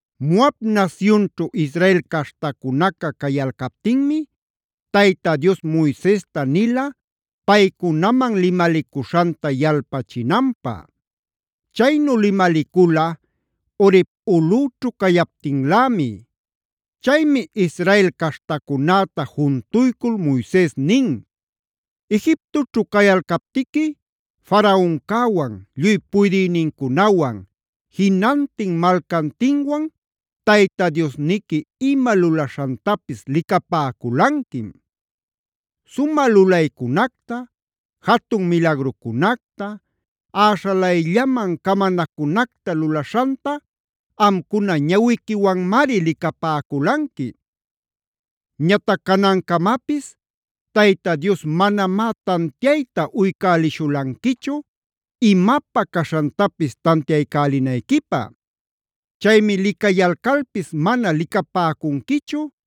Moab nasyunćhu Israel caśhtacunaca cayalcaptinmi Tayta Dios Moisesta nila paycunaman limalicuśhanta yalpachinanpä. Chaynu limalicula Horeb ulꞌüćhu cayaptinlämi. Chaymi Israel caśhtacunäta juntuycul Moises nin: “Egiptoćhu cayalcaptiqui Faraoncäwan, lluy puydïnincunawan, jinantin malcantinwan Tayta Diosniqui ima lulaśhantapis licapäculanquim. Sumä lulaycunacta, jatun milagrucunacta, äśhalayllaman camanacunacta lulaśhanta amcuna ñawiquiwanmari licapäculanqui. Ñatac canancamapis Tayta Dios manamá tantiayta uycälishulanquichu imapä caśhantapis tantiaycälinayquipä. Chaymi licayalcalpis mana licapäcunquichu,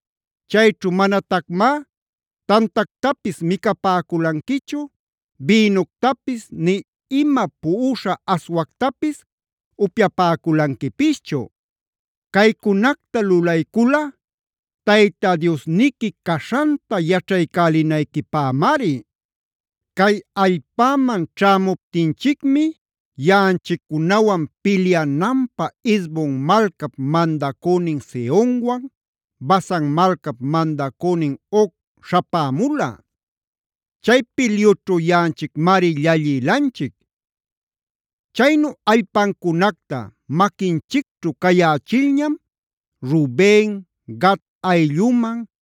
Chayćhu manatacmá tantactapis micapäculanquichu, bïnuctapis nï ima puꞌuśha aswactapis upyapäculanquipischu. Caycunacta lulaycula Tayta Diosniqui caśhanta yaćhaycälinayquipämari. “Cay allpäman ćhämuptinchicmi yaꞌanchiccunawan pilyananpä Hesbonb malcap mandacünin Sehonwan, Basanc malcap mandacünin Og śhapämula. Chay pilyućhu yaꞌanchicmari llallïlanchic. Chaynu allpancunacta maquinchicćhu cayächilñam Ruben, Gad aylluman,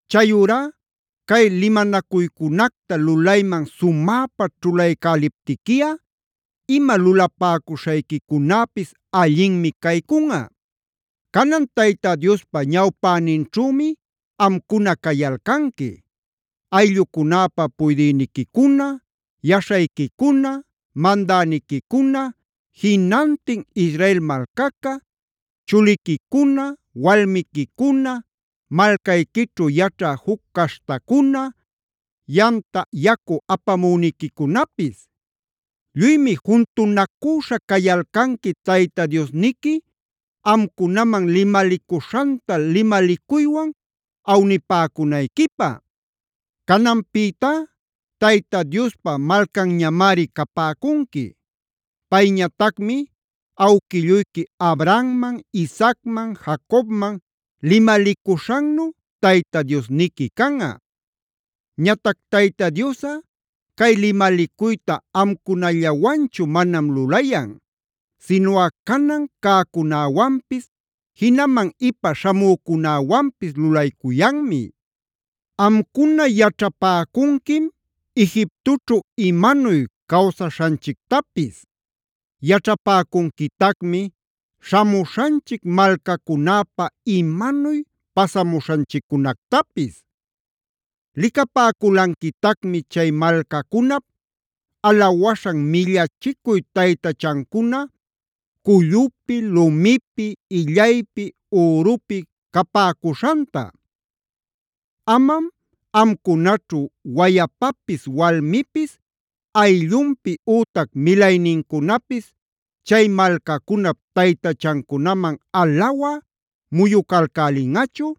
Chayurá cay limanacuycunacta lulayman sumäpa ćhulaycäliptiquiꞌa ima lulapäcuśhayquicunäpis allinmi caycunꞌa. “Canan Tayta Diospa ñawpäninćhümi amcuna cayalcanqui: Ayllucunäpa puydïniquicuna, yaśhayquicuna, mandäniquicuna, jinantin Israel malcaca, chuliquicuna, walmiquicuna, malcayquićhu yaćhä juc caśhtacuna, yamta yacu apamüniquicunapis. Lluymi juntunacüśha cayalcanqui Tayta Diosniqui amcunaman limalicuśhanta limalicuywan awnipäcunayquipä. Cananpïtá Tayta Diospa malcanñamari capäcunqui; payñatacmi awquilluyqui Abrahamman, Isaacman, Jacobman limalicuśhannu Tayta Diosniqui canꞌa. Ñatac Tayta Diosꞌa cay limalicuyta amcunallawanchu manam lulayan; sinuꞌa canan cäcunäwanpis jinaman ipa śhamücunäwanpis lulaycuyanmi. Amcuna yaćhapäcunquim Egiptoćhu imanuy cawsaśhanchictapis. Yaćhäpäcunquitacmi śhamuśhanchic malcacunäpa imanuy pasamuśhanchiccunactapis. Licapäculanquitacmi chay malcacunap alawaśhan millachicuy taytachancuna cullupi, lumipi, illaypi ürupi capäcuśhanta. Amam amcunaćhu wayapapis, walmipis, ayllunpis ütac milaynincunapis chay malcacunap taytachancunaman alawä muyucalcälinꞌachu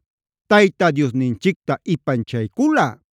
Tayta Diosninchicta ipanchayculꞌa.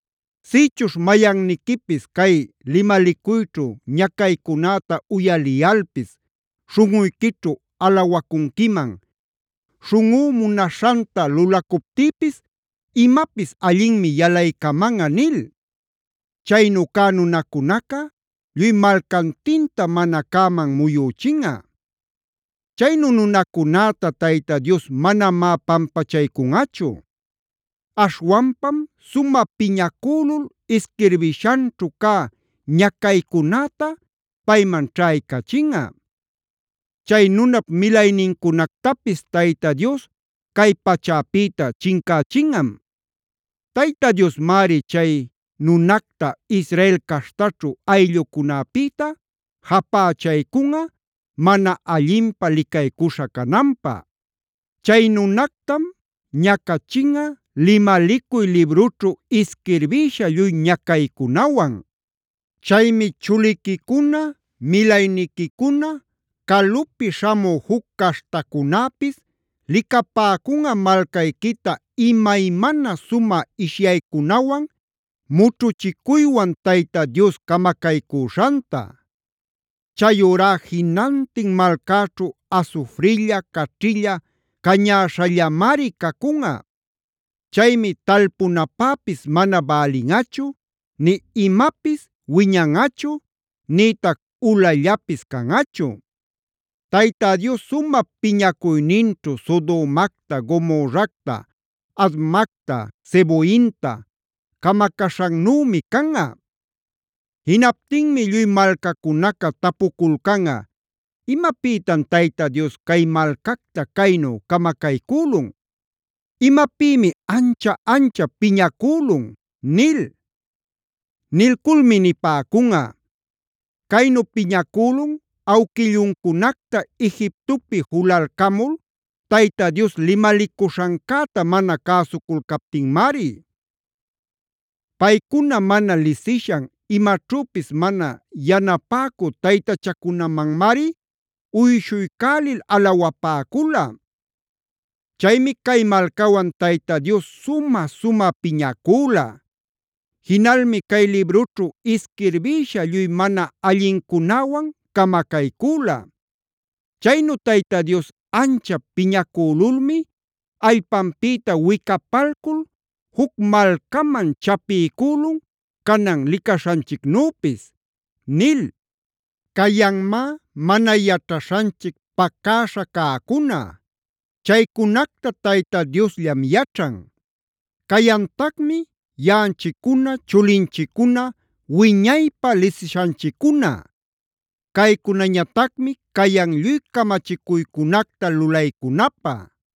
Sïchuśh mayanniquipis cay limalicuyćhu ñacaycunäta uyaliyalpis śhunꞌuyquićhu alawacunquiman: ‘Śhunꞌú munaśhanta lulacuptïpis imapis allinmi yalaycamanꞌa’ nil. Chaynu cä nunacunaca lluy malcantintam mana cäman muyüchinꞌa. Chaynu nunacunäta Tayta Dios manamá pampachaycunꞌachu. Aśhwanpam sumä piñacülul isquirbishanćhu cä ñacaycunäta payman ćhaycachinꞌa; chay nunap milaynincunactapis Tayta Dios cay pachäpïta chincächinꞌam. Tayta Diosmari chay nunacta Israel caśhtaćhu ayllucunapïta japächaycunꞌa mana allinpä licaycuśha cananpä. Chay nunactam ñacachinꞌa limalicuy librućhu isquirbïsha lluy ñacaycunawan. “Chaymi chuliquicuna, milayniquicuna, calupi śhamü juc caśhtacunäpis licapäcunꞌa malcayquita imaymana sumä ishyaycunawan, mućhuchicuywan Tayta Dios camacaycüśhanta. Chayurá jinantin malcäćhu asufrilla, caćhilla, cañäśhallamari cacunꞌa. Chaymi talpunapäpis mana bälinꞌachu, nï imapis wiñanꞌachu, nïtac ulallapis canꞌachu. Tayta Dios sumä piñacuyninćhu Sodomacta, Gomorracta, Admacta, Zeboimta camacaśhannümi canꞌa. Jinaptinmi lluy malcacunaca tapuculcanꞌa: ‘¿Imapïtam Tayta Dios cay malcacta caynu camacaycülun? ¿Imapïmi ancha-anchap piñacülun?’ nil. Nilculmi nipäcunꞌa: ‘Caynu piñacülun awquilluncunacta Egiptopi julalcamul Tayta Dios limalicuśhancäta mana cäsuculcaptinmari. Paycuna mana lisishan, imaćhüpis mana yanapäcü taytachacunamanmari uyshuycälil alawapäcula. Chaymi cay malcawan Tayta Dios sumä-sumä piñacüla. Jinalmi cay librućhu isquirbïsha lluy mana allincunäwan camacaycüla. Chaynu Tayta Dios anchap piñacülulmi allpanpïta wicapalcul juc malcaman chapiycülun canan licaśhanchicnüpis’ nil. “Cayanmá mana yaćhaśhanchic pacäśha cäcuna; chaycunacta Tayta Diosllam yaćhan. Cayantacmi yaꞌanchiccuna, chulinchiccuna wiñaypä lisishanchiccuna; caycunañatacmi cayan lluy camachicuycunacta lulaycunapä.